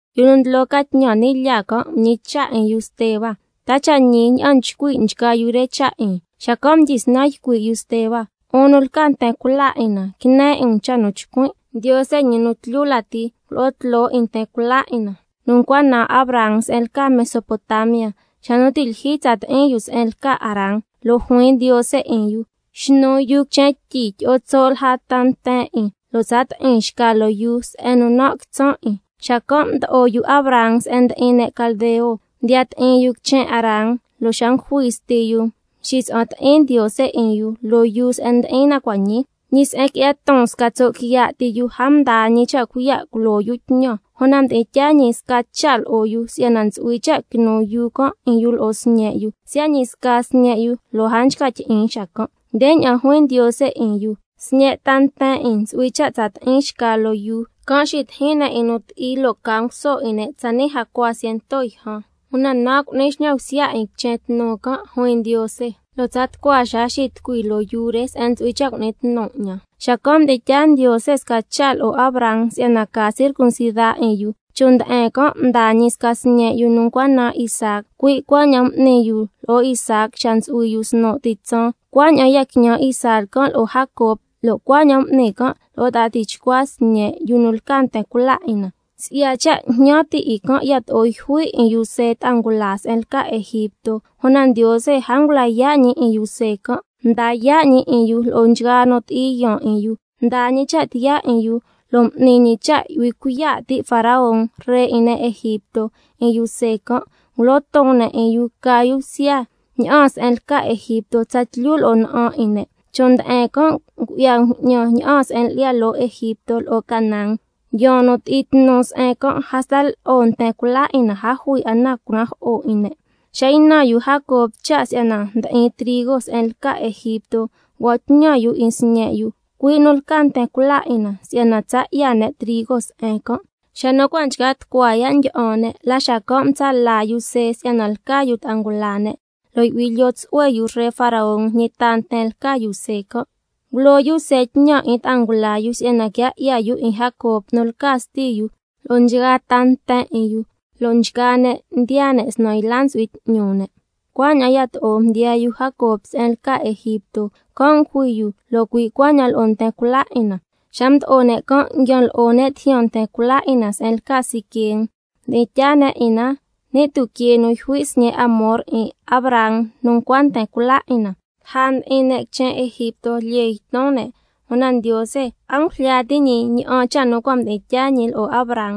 Yu nu ndlo ca tñan ni' lyaa can' mñicha' 'in yu Steba: ¿Ta cha' ñi ña'an nchcui' nchgaa yu re cha' 'in? Xacan' mdyisnan ycui' yu Steba: 'Un nu lca nten cula 'in na, quine 'in um cha' nu chcuin'. Ndiose ñi nu tlyu lati ngulo'o tloo 'in nten cula 'in na nu ncua naan Abraham se'en lca Mesopotamia, xa nu ti' lyijyi tsa ti'in yu se'en lca Harán, lo' juin Ndiose 'in yu: —Xnu yuu quichen tyi, tyi'o tso' lja ta nten 'in, lo' tsa ti'in xca loo yuu se'en nu nan' quitsan' 'in—. Xacan' mdo'o yu Abraham se'en ndi'in ne' caldeo, mdiya ti'in yu quichen Harán, lo' xa ngujui sti yu mxitsa'an ti'in Ndiose 'in yu loo yuu se'en ndi'in na cua' ñii. —Ñi se'en qui'ya ton sca tso' quiya' ti yu—, a mdaa ñi cha' cuiya' culo yu tñan. —Una mdi'in tyaa ñi sca cha' lo'o yu si'yana ntsu'hui cha' quinu yuu can' 'in yu lo'o sñe' yu—, siya' ñi sca sñe' yu lo' a nchca tyi'in xacan'. Ndeña'an juin Ndiose 'in yu: —Sñe' ta nten 'in ntsu'hui cha' tsa ti'in xca loo yuu, can' xitijin ne' 'in nu ti'i lo' ca nguso 'in ne' tsani' jacua ciento yjan—. Una nan' cu'ni xñan bsya 'in quichen tnu can', juin Ndiose, —lo' tsa tucua xaa xitucui loo yuu se'en ntsu'hui cha' cu'ni tnu 'ñan—. Xacan' mdi'in tyaa Ndiose sca cha' lo'o Abraham si'yana ca circuncida 'in yu, chon' nde'en can' mdaa ñi sca sñe' yu nu ncua naan Isaac, cui' cuaña'an m'ni yu lo'o Isaac xa ntsu'hui yu snu' ti tsaan, cuaña'an ya quiñan Isaac can' lo'o Jacob, lo' cuaña'an m'ni can' lo'o ta'a tichcua sñe' yu nu lca nten cula 'in na. Si'ya cha' jñan ti' 'in can' yato'o yjui' 'in yu See ta'a ngula se'en lca Egipto, una Ndiose a ngula yaa' ñi 'in yu See can', mda yaa' ñi 'in yu lo'o nchgaa nu ti'i yaan 'in yu, —mdaa ñi cha' tiyaa 'in yu lo' m'ni ñi cha' yu'hui cuiya' ti' Faraón, ree 'in ne' Egipto, 'in yu See can', ngulo ton ne' 'in yu ca yu bsya ña'aan se'en lca Egipto, tsatlyu lo'o na'an 'in ne'—. Chon' nde'en can' ngu'ya bju'ñan ña'aan se'en lyi'ya loo Egipto lo'o Canaán, yaan nu ti'i tnu se'en can', hasta lo'o nten cula 'in na a jui 'a na nu cunajo'o 'in ne'. Xa ynan yu Jacob cha' si'yana ndi'in trigo se'en lca Egipto, ngua'an tñan yu 'in sñe' yu, cui' nu lca nten cula 'in na, si'yana tsa 'ya ne' trigo se'en can'. Xa nu cua' nchca tucua ya' ndyi'an ne', la xacan' mtsa' la yu See si'yana lca yu ta'a ngula ne', lo' yu'hui lyoo tsu'hue yu ree Faraón ñi ta nten lca yu See can'. Ngulo yu See tñan 'in ta'a ngula yu, si'yana quia 'ya yu 'in Jacob nu lca sti yu lo'o nchgaa ta nten 'in yu, loo nchgaa ne' ndiyaa ne' snan yla ntsu'hui 'tñu ne'. Cuaña'an yato'o mdiyaa yu Jacob se'en lca Egipto, can' ngujui yu, lo' cui' cuaña'an lo'o nten cula 'in na. Xa mdo'o ne' can' nguian lo'o ne' tijyan nten cula 'in na se'en lca Siquem, mdi'in tyaa ne' 'in na ni' tuquee nu yjui' sñe' Hamor 'in Abraham nu ncua nten cula 'in na. Lja mdi'in ne' quichen Egipto lyee yton ne', una Ndiose a ngujlya ti' ñi ña'an cha' nu cua' mdi'in tyaa ñi lo'o Abraham,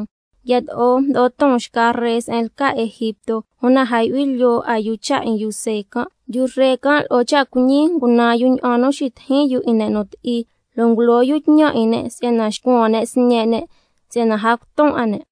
yato'o mdo'o ton xca ree se'en lca Egipto, una a yu'hui lyoo 'a yu cha' 'in yu See can'. Yu ree can' lo'o cha' cuiñi ngunan yu ña'an nu xitijin yu 'in ne' nu ti'i, lo' ngulo yu tñan 'in ne' si'yana xcuan ne' sñe' ne' si'yana a cuton 'a ne'.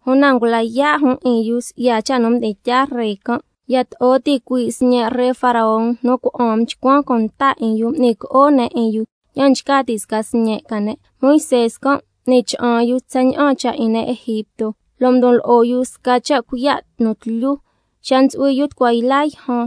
Una ngula yaa' jun 'in yu si'ya cha' nu mdi'in tyaa ree can', yato'o ticuii' sñe' ree Faraón nu cuna'an mchcuan cunta 'in yu, m'ni co'o ne' 'in yu ña'an nchca ti' sca sñe' ca ne'. Moisé can' m'ni cha'an yu tsaña'an cha' 'in ne' Egipto, lo' mdon lo'o yu sca cha' cuiya' nu tlyu. Xa ntsu'hui yu tucua yla yjan,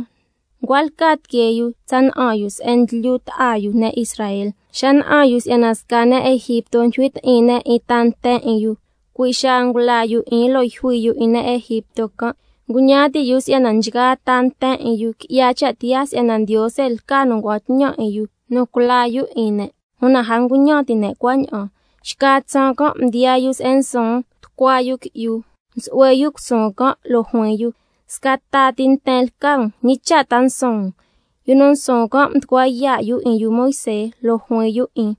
ncua lca tiquee yu tsa na'an yu se'en ndlyu ta'a yu, ne' Israel. Xa na'an yu si'yana sca ne' Egipto ndyijui ti'in ne' 'in ta nten 'in yu, cui' xaa ngula yu 'in lo' yjui yu 'in ne' Egipto can'. Nguñan ti' yu si'yana nchgaa ta nten 'in yu qui'ya cha' tiyaa si'yana Ndiose lca nu ngua'an tñan 'in yu nu culaa yu 'in ne', una a nguñan ti' ne' cuaña'an. Xca tsaan can' mdiyaa yu se'en nsuun tucua yu qui'yu, msu'hue yu cusuun can', lo' juin yu: Sca ta ti nten lca um, ¿ñi cha' ta nsuun um? Yu nu nsuun can' mducua yaa' yu 'in yu Moisé, lo' juin yu 'in: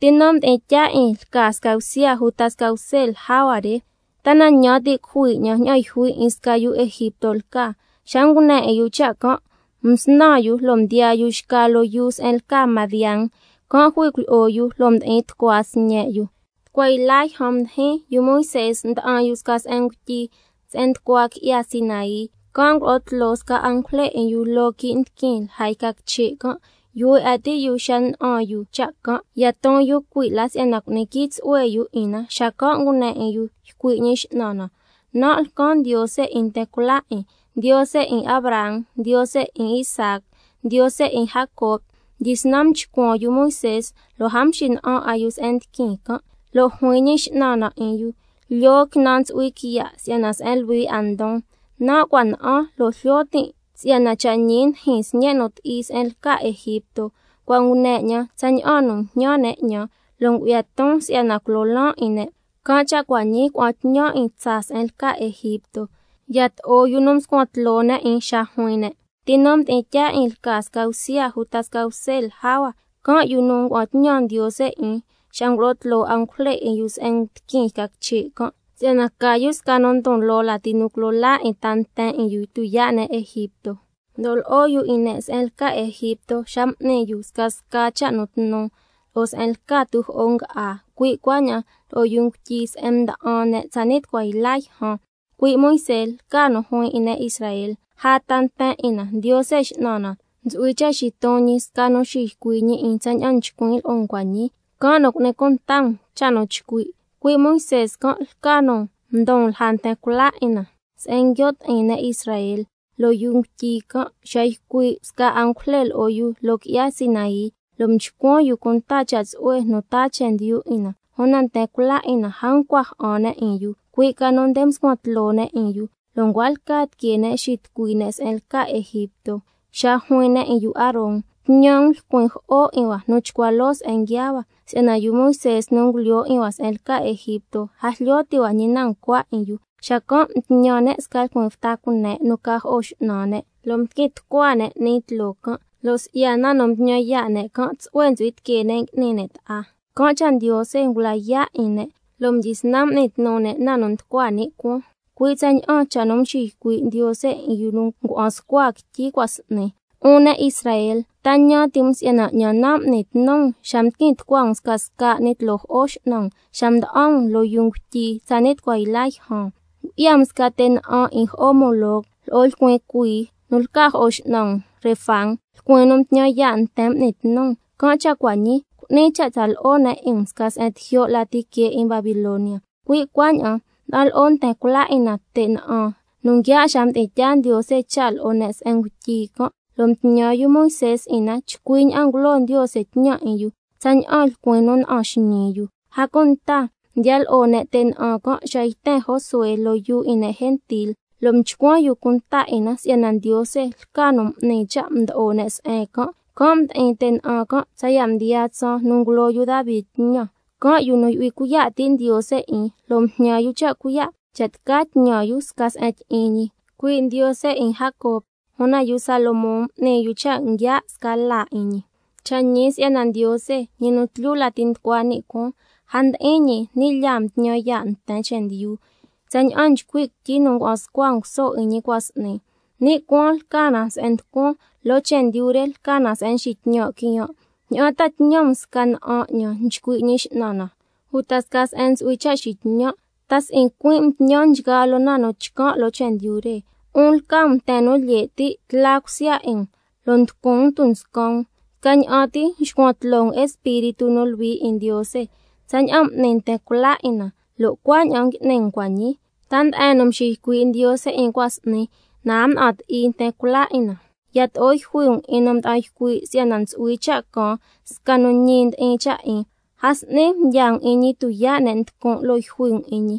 ¿—Ti nu mdi'in tyaa 'in lca sca bsya uta sca bse lja hua re? ¿Ta na ñan ti' cujui 'ñan ña'an yjui 'in sca yu Egipto lca—? Xa ngune 'in yu cha' can', msnan yu lo' mdiyaa yu xca loo yuu se'en lca Madián, can' jui cuilyi'o yu lo' mdi'in tucua sñe' yu. Tucua yla yjan mdijin, yu Moisé nda'an yu sca se'en ngutyi se'en nducua qui'ya Sinai, can' ngulo'o tloo sca angujle 'in yu loo quii' ndiquin lja yca quiche' can'. Yuhue 'a ti' yu xa na'an yu cha' can', ya ton yu cui' la si'yana cu'ni quii tsu'hue yu 'in na, xacan' ngune 'in yu ycui' Ñi X'nan na: —Nan' lcan Ndiose 'in nten cula 'in, Ndiose 'in Abraham, Ndiose 'in Isaac, Ndiose 'in Jacob. Mdyisnan mchcuan yu Moisé lo' a mxina'an 'a yu se'en ndiquin can'—. Lo' juin Ñi X'nan na 'in yu: —Lyoo quinan ntsu'hui quiya' si'yana se'en luhui 'a ndon. Nan' cua' na'an lo' jlyo tin' si'yana cha' ñi ndijin sñe' nu ti'i se'en lca Egipto, cua' ngune 'ñan tsaña'an nu njñan ne' 'ñan, lo' ngu'ya ton si'yana culo laan 'in ne'. Can' cha' cua' ñii ca'an tñan 'in tsaa se'en lca Egipto—. Yato'o yu nu mscuan tloo ne' 'in xa juin ne': ¿Ti nu mdi'in tyaa 'in lca sca bsya uta sca bse lja hua? Can' yu nu ngua'an tñan Ndiose 'in xa ngulo'o tloo angujle 'in yu se'en ndiquin yca quiche' can', si'yana ca yu sca nu ndon loo lati nu culo laa 'in ta nten 'in yu tuyaa' ne' Egipto. Mdo'o lo'o yu 'in ne' se'en lca Egipto xa m'ni yu scasca cha' nu tnu, lo'o se'en lca tujo'o nga'á, cui' cuaña'an loo yuu ngutyi se'en mda'an ne' tsani' tucua yla yjan. Cui' Moisé lca nu juin 'in ne' Israel: Lja ta nten 'in na, Ndiose X'nan na, ntsu'hui cha' xiton ñi sca nu xiycui' ñi 'in tsaña'an nchcuin' lo'o um cua' ñii, can' nu cu'ni cunta um cha' nu chcui'. Cui' Moisé can' lca nu mdon lja nten cula 'in na se'en nguio' ti'in ne' Israel loo yuu ngutyi can', xa ycui' sca angujle lo'o yu loo qui'ya Sinai, lo' mchcuan yu cunta cha' tsu'hue nu taa chendyu 'in na. Una nten cula 'in na a ncua ja'an ne' 'in yu, cui' ca nu nde mscuan tloo ne' 'in yu, lo' ncua lca tiquee ne' xitucui ne' se'en lca Egipto, xa juin ne' 'in yu Aaron: —Tñan um lcuin jo'o 'in hua nu chcua loo se'en nguiaa hua, si'yana yu Moisé nu ngulyoo 'in hua se'en lca Egipto, a jlyo ti' hua ñi na ncua 'in yu—. Xacan' mtñan ne' sca lcuin bta cune' nu ca jo'o x'nan ne', lo' mdiquin tucua ne' 'ni tloo can', lo' si'ya na nu mtñan yaa' ne' can', tsu'hue ntsu'hui tiquee ne' ngui'ni ne' ta'a. Can' cha' Ndiose ngula yaa' 'in ne', lo' mdyisnan m'ni tnu ne' na nu nducua ni' cuaan, cui' tsaña'an cha' nu mxiycui' Ndiose 'in yu nu ngua'an scua quityi cua' s'ni: —Un ne' Israel, ¿ta ñan ti' um si'yana 'ñan nan' m'ni tnu um xa mdiquin tucua um scasca 'ni tloo jo'o x'nan um xa mda'an um loo yuu ngutyi tsani' tucua yla yjan? Ngu'ya um sca te' na'an 'in jo'o Moloc, lo'o lcuin cuii nu lca jo'o x'nan um Renfán, lcuin nu mtñan yaa' nten m'ni tnu um. Can' cha' cua' ñii cu'nin cha' tsa lo'o ne' 'in um sca se'en tijyo' lati que 'in Babilonia—. Cui' cuaña'an mda'an lo'o nten cula 'in na te' na'an nu nguia' xa mdi'in tyaa Ndiose cha' lo'o ne' se'en ngutyi can', lo' mtñan yu Moisé 'in na chcui ña'an ngulo Ndiose tñan 'in yu, tsaña'an lcuin nu na'an xñii yu. A cunta mdiya lo'o ne' te' na'an can' xa yten Josué loo yuu 'in ne' gentil, lo' mchcuan yu cunta 'in na si'yana Ndiose lca nu m'ni cha' mdo'o ne' se'en can', can' mdi'in te' na'an can' tsaya' mdiyaa tsaan nu ngulo yu Davi tñan. Can' yu nu yu'hui cuiya' ti' Ndiose 'in, lo' mjñan yu cha' cuiya' cha' tca tñan yu sca se'en tyi'in ñi, cui' Ndiose 'in Jacob. Una yu Salomón m'ni yu cha' nguia' sca laa 'in ñi. Cha' ñi si'yana Ndiose, ñi nu tlyu lati nducua ni' cuaan, a ndyi'in ñi ni' lyaa mtñan yaa' nten chendyu, tsaña'an nchcui' quityi nu ngua'an scua nguso 'in ñi cua' s'ni: —Ni' cuaan lca na se'en nducuan, lo' chendyu re lca na se'en nxitñan' quiyan', ¿ña'an ta tñan um sca na'an 'ñan, nchcui' Ñi X'nan na, uta sca se'en ntsu'hui cha' xitñan'? ¿Ta si'i cuin' mtñan nchgaa loo na nu chcan' loo chendyu re? 'Un lca um nten nu lye' ti', tla cusya 'in um, lo' nducun tunscan um—, scaña'an ti nxcuan tloo um Espíritu nu Luhui 'in Ndiose. Tsaña'an m'ni nten cula 'in na, lo' cuaña'an ngui'ni um cua' ñii. ¿Ta nde'en nu mxiycui' Ndiose 'in cua' s'ni, na a mna'an ti'i nten cula 'in na? Yato'o yjui um 'in nu mda'an ycui' si'yana ntsu'hui cha' caan sca nu ñi ndi'in cha' 'in, a s'ni mdyaa um 'in ñi tuyaa' ne' nducun' lo' yjui um 'in ñi,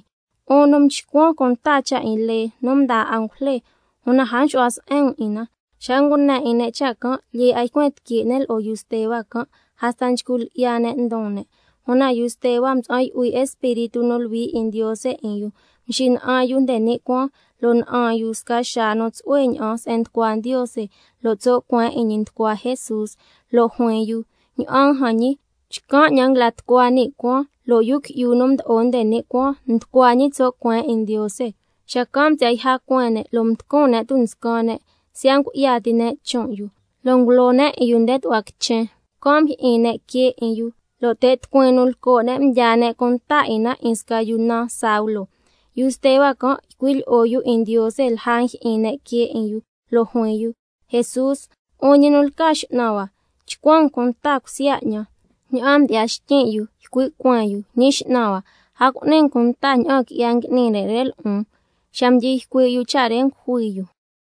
'un nu mchcuan cunta cha' 'in lee nu mdaa angujle, una a mxu'hua se'en um 'in na. Xa ngune 'in ne' cha' can', lyee 'a ycuen tiquee ne' lo'o yu Steba can', hasta nchcu lyi'ya ne' ndon ne'. Una yu Steba mtsa'an yu'hui Espíritu nu Luhui 'in Ndiose 'in yu, mxina'an yu nde ni' cuaan lo' na'an yu sca xaa nu tsu'hue ña'an se'en nducua Ndiose, lo' tso' cueen 'in ñi nducua Jesús. Lo' juin yu: Ña'an jan ñi, chcan' 'ñan nguila tucua ni' cuaan, lo' Yu Qui'yu nu Mdo'o nde ni' Cuaan nducua ñi tso' cueen 'in Ndiose. Xacan' msi'ya yja cueen ne', lo' mducun ne' tunscan ne', lo' siya' ngu'ya ti ne' chon' yu, ngulo ne' 'in yu nde tu'hua quichen, can' mjyi'in ne' quee 'in yu, lo' te' tucuin nu lco' ne' mdyaa ne' cunta 'in na 'in sca yu naan Saulo. Yu Steba can' ycui' lyi'o yu 'in Ndiose lja njyi'in ne' quee 'in yu, lo' juin yu: Jesús, 'un ñi nu lca X'nan hua, chcuan um cunta cusya 'ñan. Ña'aan mdyi'ya xtyin' yu, ycui' cueen yu: Ñi X'nan hua, a cu'ni um cunta ña'an qui'ya ngui'ni ne' re lo'on. Xa mdyi ycui' yu cha' re ngujui yu.